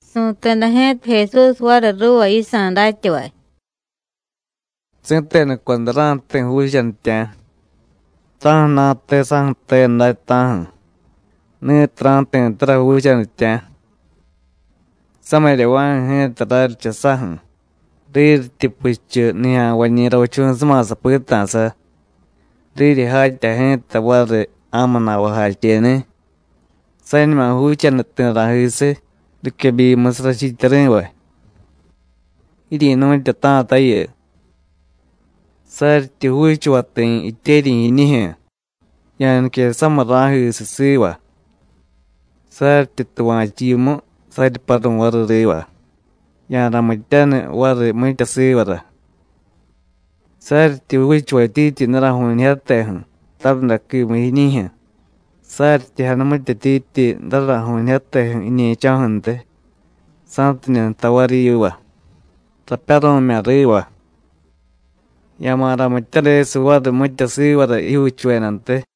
Su̱teda ji̱ta Jesús variy ruuva yisa̱ datyavay: “Si̱tenuco day ra̱jti̱ juuchanitya̱, ta̱ju̱na̱te saju̱te day, ta̱ju̱, ni̱tiy ra̱jti̱tara juuchanitya̱. Samiryava̱ju̱ ji̱ta raryicha saju̱, riryityi puchu nijya̱nvañi̱ ravichu̱suma sapita̱sa, riryi jatya ji̱ta variy ja̱mu na̱vajacheni̱, sañuma juuchanu ti̱ ra̱jisiy riquebyimusiy rachiityari̱vay. ¡Jiryi̱nu̱tyata̱tayu! Saryityi juuchuvay ti̱ jityeryi̱ jiñijyu̱, ya̱nique samiy ra̱jisiy siva. Saryityi tuva̱chu yimu, saryi paru̱y variy riva, ya̱ramityaniy variy mitya sivara. Saryityi juuchuvatyityi daraju̱ñijyateju̱ tarundaquimu jiiñijyu̱, saryityi janumityetyityi daraju̱ñijyateju̱ jiñe̱cho̱ju̱ntiy, sa̱tidye jtay variy yiva: Rapyaru̱mya̱ riva, ya̱ma̱ ramityadesiy variy mitya sivara jijyuuchuvedantiy.”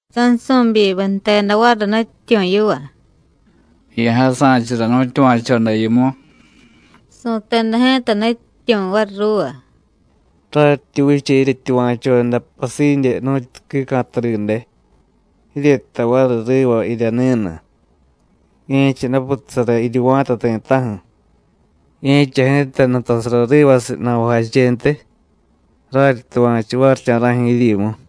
Sansu̱byimiy jteda variy Nutyityu̱ yiva: “Ya̱jasa̱chura nu̱tyuva̱choda yimu.” Su̱teda ji̱ta Nutyityu̱ variy ruuva: “Raryityi vicha jiryetyuva̱choda pasidye nu̱tyu quica̱tadide, jiryejtay variy riva jirya ni̱nu: Ye̱cha daputasara jiryuva̱ta ti̱ta̱ju̱, ye̱cha ji̱ta nutasara rivasiy na̱vajachentiy, raryityuva̱chu varicha̱ra̱ju̱ jiryimu.”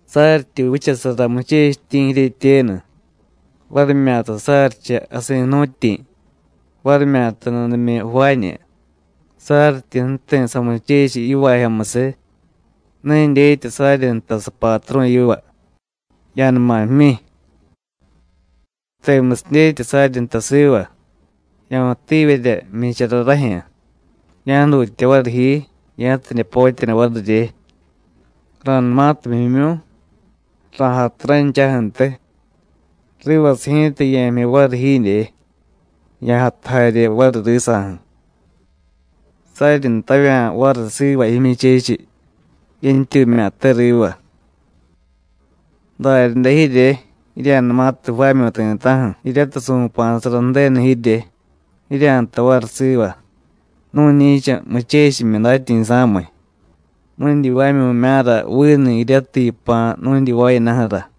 “Saryityi vichasara muchechityi̱ jiryetyenu, varimyata saryicha jasi̱ jnu̱tyi̱, varimyata nudimyu jvaañu, saryityi ju̱ti̱ samuchechiy yivaajyomusiy, ne dyetya saryi ntay sapatru̱ yiva: Ya̱numa jmyi. Temusiy dyetya saryi ntay siva: Ya̱mutivyerya jmyichara rajyu̱, ya̱jdutya variy ji, ya̱tidye potyaniy varirye. Ra̱numatiy jmyimyu̱y, ra̱jatu ranchaju̱ntiy, rivasiy ji̱ta ye̱jmyi variy jiidye, ya̱jatu jarye variy risa̱ju̱. ¿Saryi ntavya̱ variy siva jimyuchechiy: ¡Yentyumya̱te riva!? Daryaday jirye, jirya̱numatiy jvaamyu̱y ti̱ta̱ju̱ jiryatiy su̱pa̱sara Ju̱denu jirye, jirya̱jtay variy siva: Nu̱ñi̱cha muchechimyi datyi̱sa̱miy. Nu̱dyivaamyu̱mya̱ra vinu jiryatiy yipa̱ nu̱dyivaayadaju̱ra.”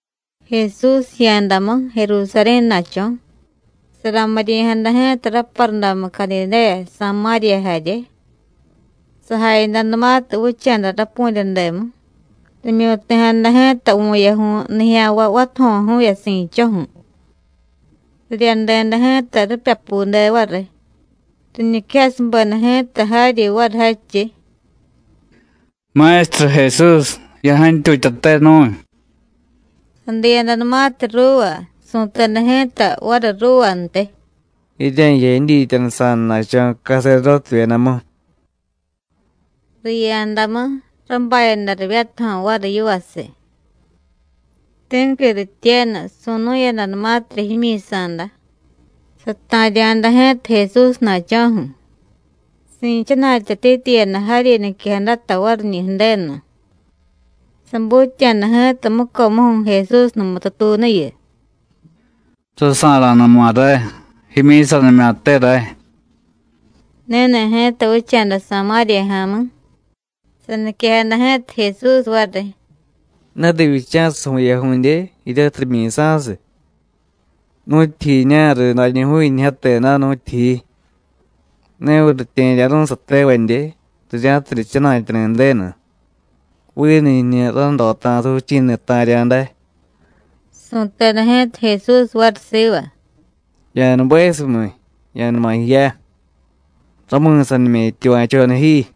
Jesús jiya̱damu Jerusarí̱na̱cho̱, saramiryi̱jada ji̱ta raparudamu Cadidéya, Samáriya jarye. Sajayadanumatiy vicha̱da rapu̱ryademu, rimyu̱ti̱jada ji̱ta vu̱yaju̱y nijya̱nvay vatajo̱ju̱vye si̱dcho̱ju̱. Riryadeda ji̱ta ripyapude variy, riñiquejasubeda ji̱ta jaryi variy jadchiy: “¡Maestru Jesús, ya̱jantyutyate nu̱y!” Sadiyadanumatiy ruuva, su̱teda ji̱ta variy ruuvantiy: “Jirya̱jiya jidyityanusa̱dana̱cho̱ caserdótevyedamu.” Riya̱damu, rabayada rivyatajo̱ variy yivasiy. Ti̱qui rityenu, su̱nu̱yadanumatirya jimyi̱sa̱da, sata̱rya̱da ji̱ta Jesúsna̱cho̱ju̱, si̱chana̱tyatityiyada jaryi niquejadata variñi̱ Ju̱denu. Sabutya̱da ji̱ta mucomuju̱ Jesús numutu tuunuyu: “Rasa̱ra̱numa ray. Jimyi̱sanimya̱te ray.” Ni̱ni̱ ji̱ta vicha̱da Samáriya ja̱mi̱. Saniquejada ji̱ta Jesús variy: “¿Ne rivyicha̱siy vu̱yaju̱dye, jiryatiy rimyi̱sa̱siy? ¿Nu̱tyijiña̱riy dañuju̱yunijyate day, nu̱tyijiy? ¿Neviy ritye̱rya̱ru̱y satevadye, rirya̱tidye jchana̱tyani̱ Ju̱denu? ¿Vinu jiñu ranrota̱sa vichi̱ni̱ ta̱rya̱ day?” Su̱teda ji̱ta Jesús variy siva: “Ya̱nubesumiy, ya̱numa jiya. Rami̱sanimya̱ jityuva̱choda ji.”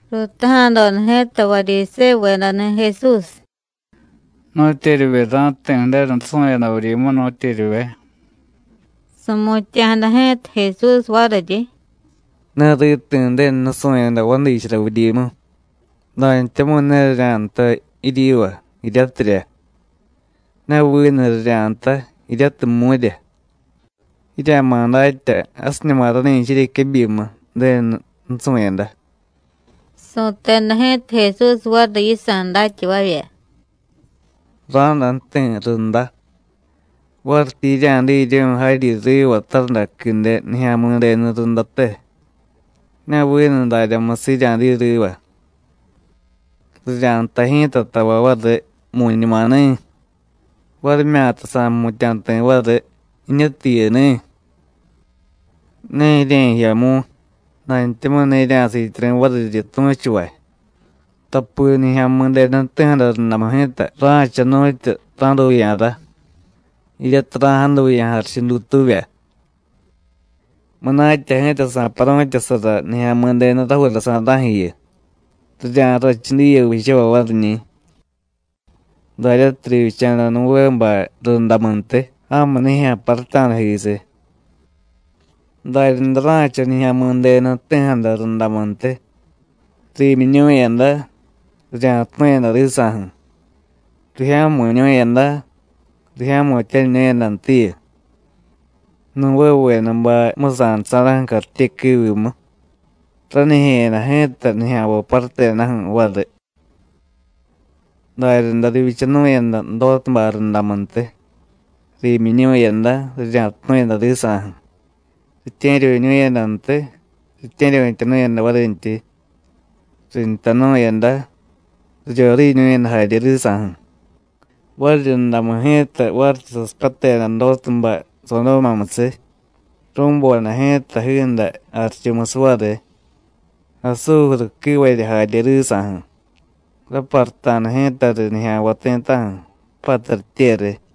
Ruutaja̱doda ji̱ta Varyisévuvedani̱ Jesús: “¿Nu̱tyeryivye ra̱jti̱ Ju̱denu nusu̱yada vuryimu, nu̱tyeryivye?” Su̱mutya̱jada ji̱ta Jesús variryi: “Ne riti̱ Ju̱denu nusu̱yada jvadichara vuryimu, dantyamu̱y ne rirya̱jtay jiryiva: ¡Jiryatirya! ne vinu rirya̱jtay jiryatiy ¡Mu̱rya! Jirya̱ma̱ datya: Jasiñuma rani̱cha jiryequebyimu Ju̱denu nusu̱yada.” Su̱teda ji̱ta Jesús variy yisa̱ datyavavya: “Ra̱day ju̱ti̱ runda, varityi jirya̱diryu̱y jaryi riva tarundaquide Nijya̱mi̱denu rundate, ne vinu daryamusiy jirya̱diy riva. Rirya̱jtay ji̱ta tavay variy: ¡Mu̱ñumani̱! varimyata sa̱jmutya̱ ti̱ variy: ¡Jiñutiy jiyuni̱! Ne jirya̱jiya mu̱y, dantyamu̱y ne jirya̱siityari̱ variryi tu̱chuvay. Tapi Nijya̱mi̱denu jti̱jada rundamu ji̱ta ra̱cha nu̱tyu ra̱duya̱ra, jiryatiy ra̱jaduya̱ jarichu dutuuvya. Munatya ji̱ta sa̱paru̱tyasara Nijya̱mi̱denu rajuura sa̱ra̱ju̱yu, rirya̱rrachu diye vichavay variñi̱. Daryatiy rivyicha̱da Nuvébay rundamuntiy, ja̱mu nijya̱ paruta̱dajisiy, daryaday ra̱cha Nijya̱mi̱denu jti̱jada rundamuntiy. Riimyiñu̱yada, rirya̱tunu̱yada risa̱ju̱, rijya̱mu̱ñu̱yada, rijya̱mu̱tyaniñu̱yadantiyu, Nuvévedabay jmusa̱dasa̱ra̱ju̱ cartyequiivimu, ranijye̱yada ji̱ta nijya̱nvay parutedaju̱ variy. Daryaday rivyichanu̱yada Dótubay rundamuntiy, riimyiñu̱yada, rirya̱tunu̱yada risa̱ju̱, ritye̱ryu̱ñu̱yadantiy, ritye̱ryu̱tyanu̱yada varintyi; rintanu̱yada, riryoriiñu̱yada jarye risa̱ju̱. Variryundamu ji̱ta varityi sasipyateda Dótubay Sodómamusiy, ru̱boda ji̱ta jiiday jarichumusiy variy, asújuru quivarya jarye risa̱ju̱, raparuta̱da ji̱ta riy nijya̱nvay ti̱ta̱ju̱, pattaryitye riy.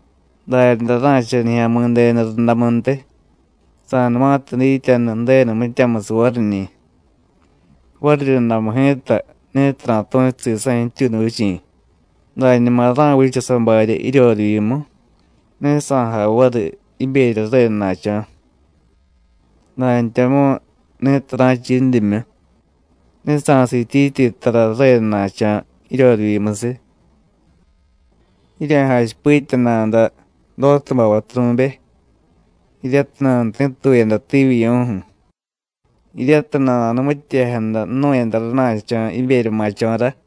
Daryaday ra̱cha Nijya̱midenu rundamuntiy, sa̱numatiy dityanu Ju̱denu mityamusiy variñi̱. Variryundamu ji̱ta, ni̱tiy ra̱tu̱chu sisa̱ jityuunu vichi̱, dañuma ra̱vicha sabarya jiryorivyimu, ne sa̱jay variy jiberya ju̱redana̱cho̱, dantyamu̱y ni̱tiy ra̱cha yindimyu, ne sa̱siityityi tara ju̱redana̱cho̱ jiryorivyimusiy. Jirya̱jachipitya nada Dótubay vaturu̱be (jiryatiy nanuti̱tuyada tivyivyu̱ju̱ jiryatiy nana̱numityejada jnu̱yada rana̱cho̱ jiberya ma̱cho̱ra.)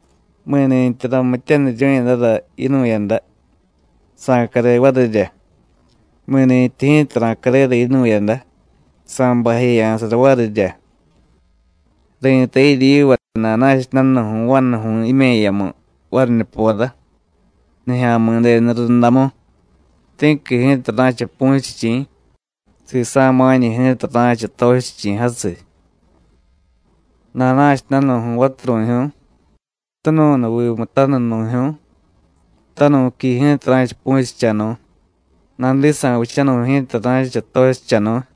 Mi̱ni̱tyi ramityaniryu̱yadara yinu̱yada, sa̱care varirya, mi̱nintyi ji̱ta ra̱carera yinu̱yada, sa̱bajeya̱sara varirya. Ri̱tay jiryiva: Nana̱cha danu̱ju̱y vanuju̱y jime̱yamu variñupora, Nijya̱mi̱denu rundamu, ti̱qui ji̱ta ra̱cha pu̱chichi̱, sisa̱ ma̱ñu ji̱ta ra̱cha tochichi̱ jasiy. Nana̱cha danu̱ju̱y vaturu̱jyu̱y tunu̱nuvimu tanunu̱jyu̱y, tanu̱qui ji̱ta ra̱cha pu̱chichanu̱y, nadisa̱ vichanu̱y ji̱ta ra̱cha tochichanu̱y.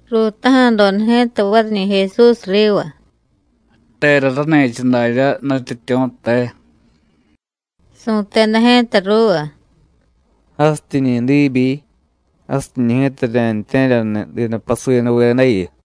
Ruutaja̱doda ji̱ta variñi̱ Jesús riva: “¿Tera rani̱cha daryá, Nutyityu̱, te?” Su̱teda ji̱ta ruuva: “Jasityiñi̱ diibyi, jasiñi̱ ji̱ta rirya̱ji̱tye̱ryaniy didapasuyanuvedayu.”